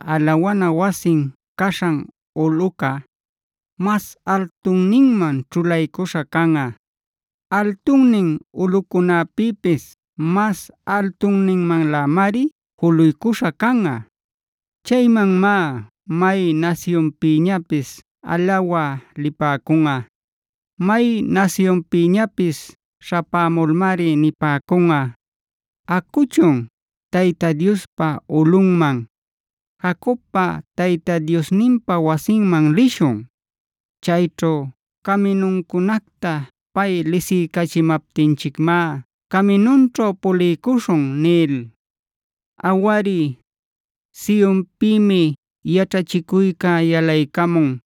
alawana wasin caśhan ulꞌuca, mas altunninman ćhulaycuśha canꞌa. Altunnin ulꞌucunäpïpis mas altunninmanlämari juluycuśha canꞌa. Chaymanmá may nasyunpïñapis alawä lipäcunꞌa. May nasyunpïñapis śhapämulmari nipäcunꞌa: “Acuchun, Tayta Diospa ulꞌunman; Jacobpa Tayta Diosninpa wasinman lishun. Chayćhu caminuncunacta pay lisiycachimaptinchicmá caminunćhu puliycuśhun” nil. Awari, Sionpïmi yaćhachicuyca yalaycamun;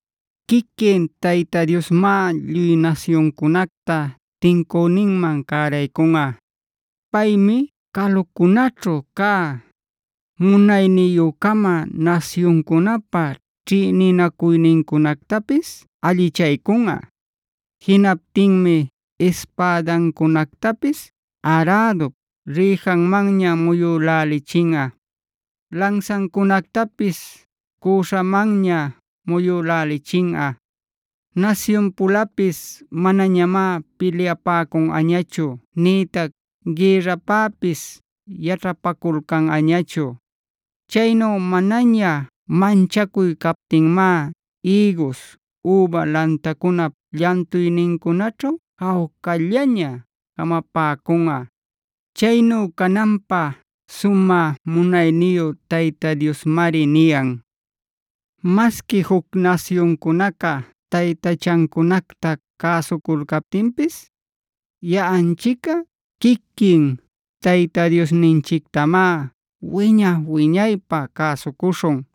Quiquin Tayta Diosmá lluy nasyuncunacta tincüninman cäraycunꞌa. Paymi calucunaćhu cä munayniyü-cama nasyuncunäpa ćhïninacuynincunactapis allichaycunꞌa. Jinaptinmi ispädancunactapis arädup rïjanmanña muyülälichinꞌa; lansancunactapis cüśhamanña muyülälichinꞌa.b Nasyun-pulapis manañamá pilyapäcunꞌañachu; nïtac gïrrapäpis yaćhapaculcanꞌañachu. Chaynu manaña manchacuy captinmá ïgus, üba lantancunap llantuynincunaćhu jawcallaña jamapäcunꞌa.c Chaynu cananpä sumä munayniyu Tayta Diosmari niyan. Masqui juc nasyuncunaca taytachancunacta cäsuculcaptinpis, yaꞌanchicꞌa quiquin Tayta Diosninchictamá wiña-wiñaypä cäsucuśhun.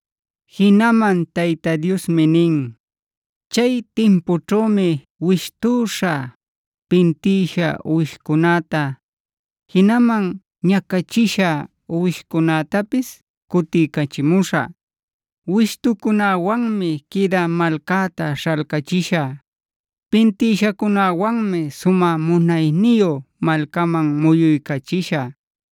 Jinaman Tayta Diosmi nin: “Chay timpućhümi wishtüśha, pintïsha uwishcunäta, jinaman ñacachishá uwishcunätapis cutiycachimuśhä. Wishtucunäwanmi quïdä malcäta śhalcachishä; pintïshacunäwanmi sumä munayniyu malcaman muyuycachishä.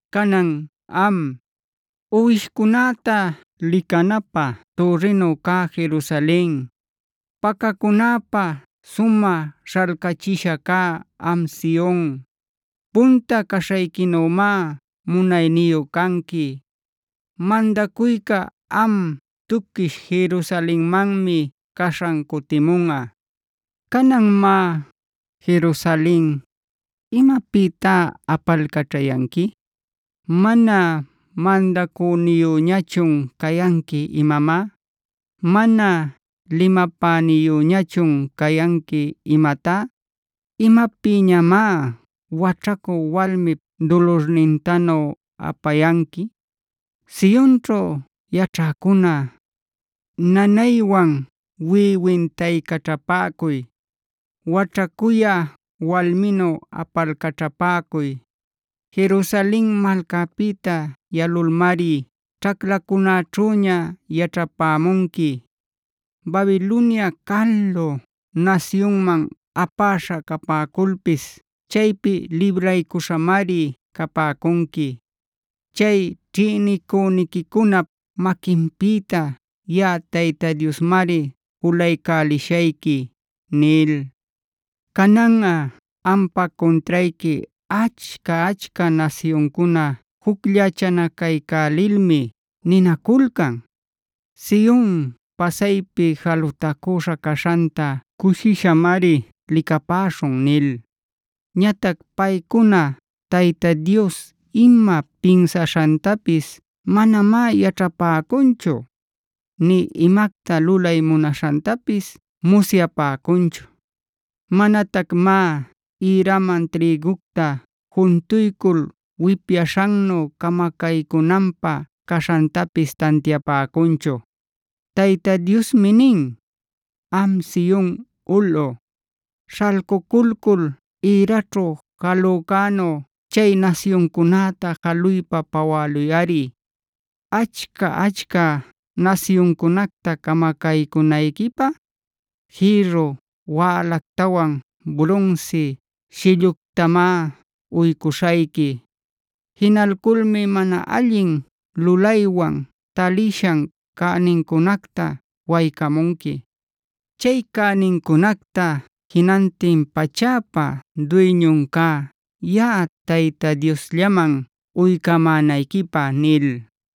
Canan am, uwishcunäta licanapä türrinu cä Jerusalen, Pacacunapä sumä śhalcachisha cä am Sion, punta caśhayquinümá munayniyu canqui; mandacuyca am tuquish Jerusalenmanmi caśhan cutimunꞌa. “Canan má, Jerusalen ¿imapïtá apalcaćhayanqui? ¿Mana mandacüniyüñachun cayanqui imamá? ¿Mana limapäniyüñachun cayanqui imatá? ¿Imapïñamá waćhacü walmip dulurnintanu apayanqui? Sionćhu yaćhäcuna, nanaywan wiꞌwintaycaćhapäcuy; waćhacuyä walminu apalcaćhapäcuy. Jerusalen malcapïta yalulmari ćhaclacunäćhüña yaćhapämunqui. Babilonia calu nasyunman apaśha capäculpis chaypi libraycuśhamari capäcunqui. Chay ćhïnicüniquicunap maquinpïta yaꞌa Tayta Diosmari julaycälishayqui” nil. Cananꞌa ampa cuntrayqui achca-achca nasyuncuna jucllachanacaycälilmi ninaculcan: “Sion pasaypi jalutacüśha caśhanta cushishamari licapäśhun” nil. Ñatac paycuna Tayta Dios ima pinsaśhantapis manamá yaćhapäcunchu; nï imacta lulay munaśhantapis musyapäcunchu. Manatacmá ïraman trïgucta juntuycul wipyaśhannu camacaycünanpä caśhantapis tantiapäcunchu. Tayta Diosmi nin: “Am Sion ulꞌu, śhalcuculcul ïraćhu jalücänu chay nasyuncunäta jaluypa pawäluyꞌari. Achca-achca nasyuncunacta camacaycünayquipä, jïrru wälactawan brunsi shilluctamá uycuśhayqui. Jinalculmi mana allin lulaywan talishan cänincunacta waycämunqui. Chay cänincunacta jinantin pachäpa duyñun cä yaꞌa Tayta Diosllaman uycamänayquipä” nil.